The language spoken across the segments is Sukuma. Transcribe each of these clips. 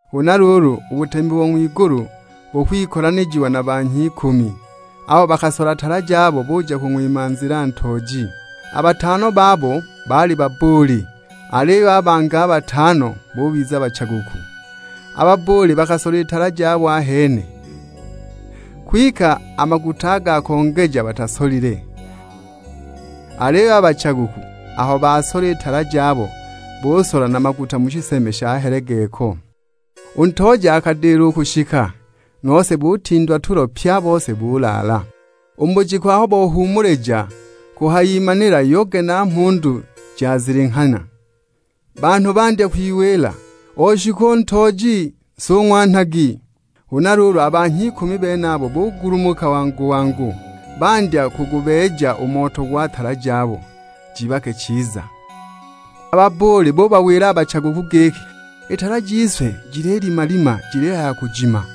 "Huna luulu, u butemi bo ng'wigulu bukwikolanijiwa na banhya ikumi, abo bakasola tala jabo buja kung'wima nzila ntooji. A batano babo baali babbuuli, aliyo a bangi a batano bubiza bachaguku. A babbuuli bakasola i tala jabo ahene, kwike a maguta a ga kongeja batasolile. Aliyo a bachaguku, aho basola i tala jabo busola na maguta mu shiseme sha helegeko. U ntooji akadila u kushika, nose butindwa tulo pye a bose, bulaala." "U bujiku aho bohuumulija, kuhayimanila yoge na mhundu jazilinghanya; banhu bandya kwiwila, 'Oshika u ntooji, nsung'wanhagi.' Huna luulu a banhya ikumi benabo bugulumuka wangu-wangu, bandya kugubeeja u moto gwa tala jabo jibake chiza. A babbuuli bubawila a bachaguku giki, 'I tala jise jililimalima jilihaya kujima,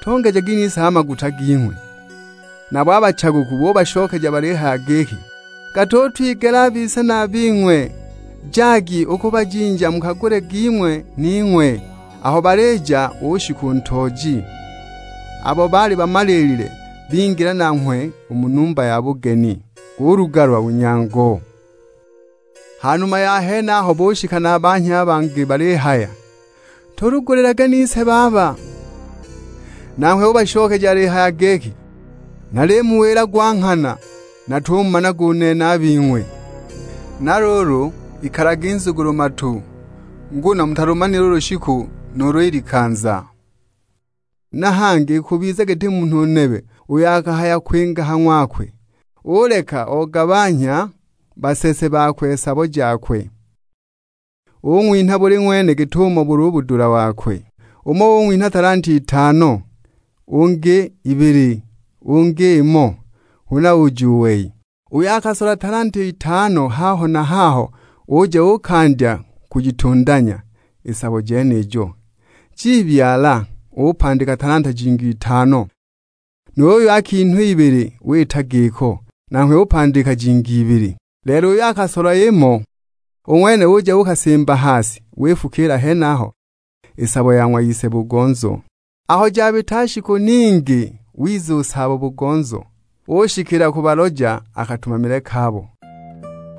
tongejagi nise a maguta ging'we.' Nabo a bachaguku bubashokeja balihaya giki, 'Gatutwigela a bise na a bing'we; jagi u ku bajinja mukagule ging'we ning'we.' Aho balija ushika u ntooji, abo baali bamaliilile bingila nanghwe u mu numba ya bugeni, gulugalwa u nyango! "Ha numa ya henaho bushika na a banhya a bangi balihaya, 'Tulugulilage nise baba!' Nanghwe ubashokeja alihaya giki, 'Nalimuwila gwa nghana natumumanaga u nene a bing'we!' Na luulu, ikalagi nzugulu-matu; nguno mutalumanile u lushiku nuulu i likanza." "Na hangi ikubiza giti munhu nebe uyo akahaya kwinga ha ng'wakwe, uleka ogabanhya basese bakwe sabo jakwe. Ung'winha buli ng'wene git'umo buli u budula bokwe; umo ung'winha talanta itano, ungi ibili, ungi imo; huna uja u wei. Uyo akasola talanta itano haho na haho uja uukandya kujitundanya i sabo jenijo, jibyalana, upandika talanta jingi itano. Nu yuyo akinhwa ibili wita giko, nanghwe upandika jingi ibili. Lelo uyo akasola imo, u ng'wene uja uukasimba ha si, wifukiila henaho i sabo ya ng'wa ise-bugonzo. "Aho jabita shiku ningi wiza u saabo-bugonzo; ushikila kubaloja a katumamile kabo.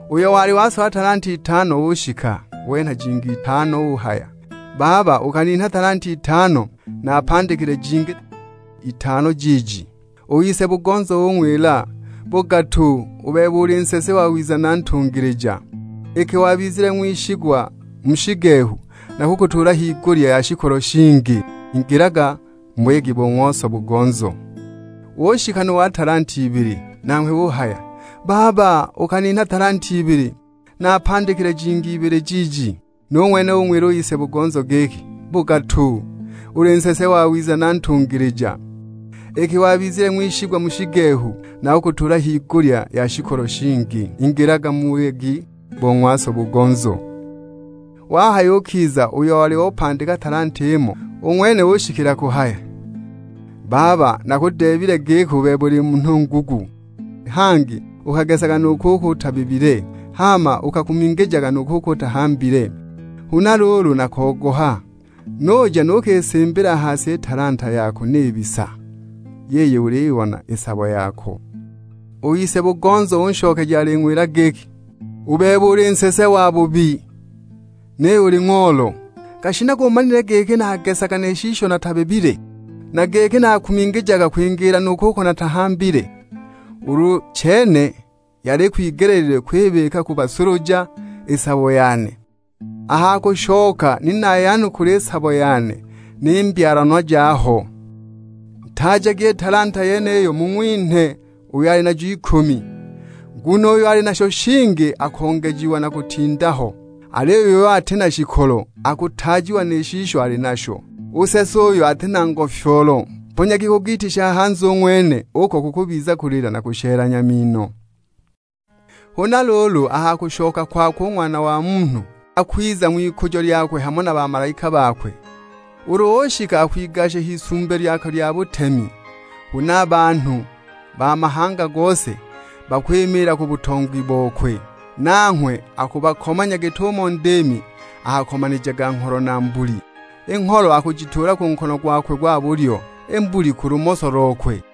Uyo wali wasola talanta itano ushika; wenha jingi itano uhaya, 'Baba, ukaninha talanta itano, naapandikile jingi itano jiiji.' U ise-bugonzo ung'wila, 'Bugatu, u bebe uli nsese wawiza na ntungilija. Iki wabizile ng'wishigwa mu shigehu nakukutuula higulya ya shikolo shingi, ingilaga mu buyegi bo ng'wa so-bugonzo.' Ushika nu wa talanta ibili, nanghwe uhaya, 'Baba ukaninha talanta ibili, naapandikile jingi ibili jiiji.' Nu ng'wene ung'wila u ise-bugonzo giki, 'Bugatu; uli nsese wawiza na ntungilija. Iki wabizile ng'wishigwa mu shigehu, nakukutuula higulya ya shikolo shingi, ingilaga mu buyegi bo ng'wa so-bugonzo.' Wahayukiza uyo oli opandika talanta imo, u ng'wene ushikila kuhaya, 'Baba nakudeebile giki u bebe uli munhu ngugu, hangi ukagesaga nu kuko utabibile, hama ukakumingijaga nu kuko utahambile. Huna luulu nakogoha, nuja nukisimbila ha si i talanta yako nibisa; yiyi uliyibona i sabo yako!' "U ise-bugonzo unshokeja aling'wila giki, 'U bebe uli nsese wabubi, niyo uli ng'oolo; gashinaga umanile giki nakagesaga ni shisho natashibibile, na giki nakakumingijaga kwingiila nu kuko natahambile! Ulu chene yali ikwigeleelilwe kwibika ku basuluja i sabo yane, a ha kushoka ni nayanukula i sabo yane ni mbyalanwa jaho. Ntaajagi i talanta yeniyo mung'winhe uyo ali najo ikumi. Nguno uyo ali nasho shingi akongejiwa na kutinda ho, aliyo uyo ati na shikolo akutaajiwa ni shisho ali nasho! U nsese uyo ati na ngofyoolo mponyagi ku giiti sha hanze u ng'wene, uko kukubiza kulila na kushelanya mino.' " "Huna luulu, a ha kushoka kwakwe u Ng'wana wa Munhu, akwiza ng'wikujo lyakwe hamo na bamalaika bakwe. Ulu ushika akwigasha h'isumbi lyakwe lya butemi. Huna a banhu ba mahanga gose, bakwimiila ku butongi bokwe. Nanghwe akubakomanya git'umo ndiimi akakomanijaga ngholo na mbuli. I ngholo akujituula ku nkono gwakwe gwa bulyo, i mbuli ku lumoso lokwe.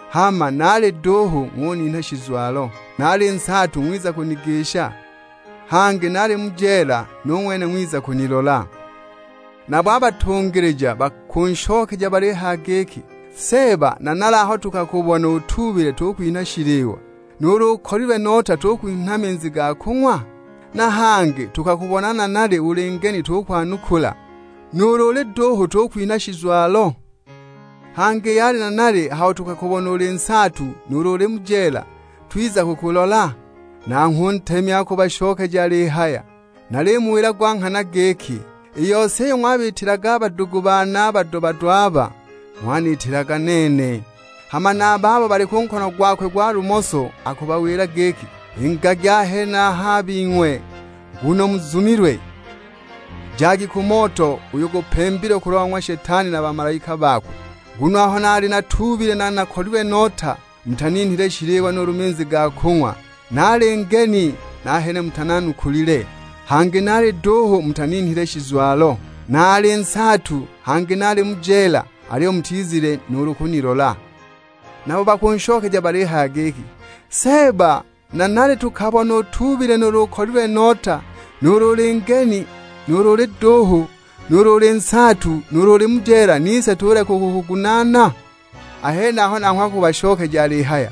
Hama naali duuhu ng'uninha shizwalo, naali nsaatu ng'wiza kunigisha, hangi naali mu jeela, nu ng'wene ng'wiza kunilola.' "Nabo a batungilija bakunshokeja balihaya giki, 'Seeba, nanali aho tukakubona utuubile tukwinha shiliwa, nuulu ukolilwe nota tukwinha minzi ga kung'wa? Na hangi tukakubona nanali uli ngeni tukwanukula, nuulu uli duuhu tukwinha shizwalo? Hangi yali nanali aho tukakubona uli nsaatu, nuulu uli mu jeela twiza kukulola?' Nanghwe u Ntemi akubashokeja alihaya, 'Nalimuwila gwa nghana giki, i yose iyo ng'wabiitilaga a badugu bane a bado-bado aba, ng'waniitilaga nene.' "Hama na a babo bali ku nkono gwakwe gwa lumoso akubawila giki, 'Ingagi a henaha a bing'we nguno muzumilwe, jagi ku moto uyo gupembilwe kulwa ng'wa Shetani na bamalaika bakwe. Nguno aho naali natuubile na nakolilwe nota, mutaninhile shiliwa nuulu minzi ga kung'wa. Naali ngeni, nahene mutananukulile, hangi naali duuhu mutaninhile shizwalo; naali nsaatu, hangi naali mu jeela, aliyo mutizile nuulu kunilola!' Nabo bakunshokeja balihaya giki, 'Seeba nanali tukakubona utuubile nuulu ukolilwe nota, nuulu uli ngeni, nuulu uli duuhu, nuulu uli nsaatu, nuulu uli mu jeela; nise tuleka u kukugunaana?' A henaho nanghwe akubashokeja alihaya;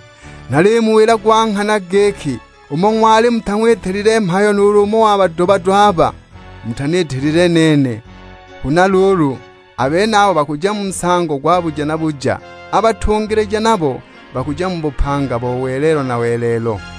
'Nalimuwila gwa nghana giki, umo ng'wali mutang'witilile mhayo nuulu umo wa bado-bado aba, mutaniitilile nene!' Huna luulu a benabo bakuja mu nsango gwa buja na buja; a batungilija nabo bakuja mu bupanga bo welelo na welelo."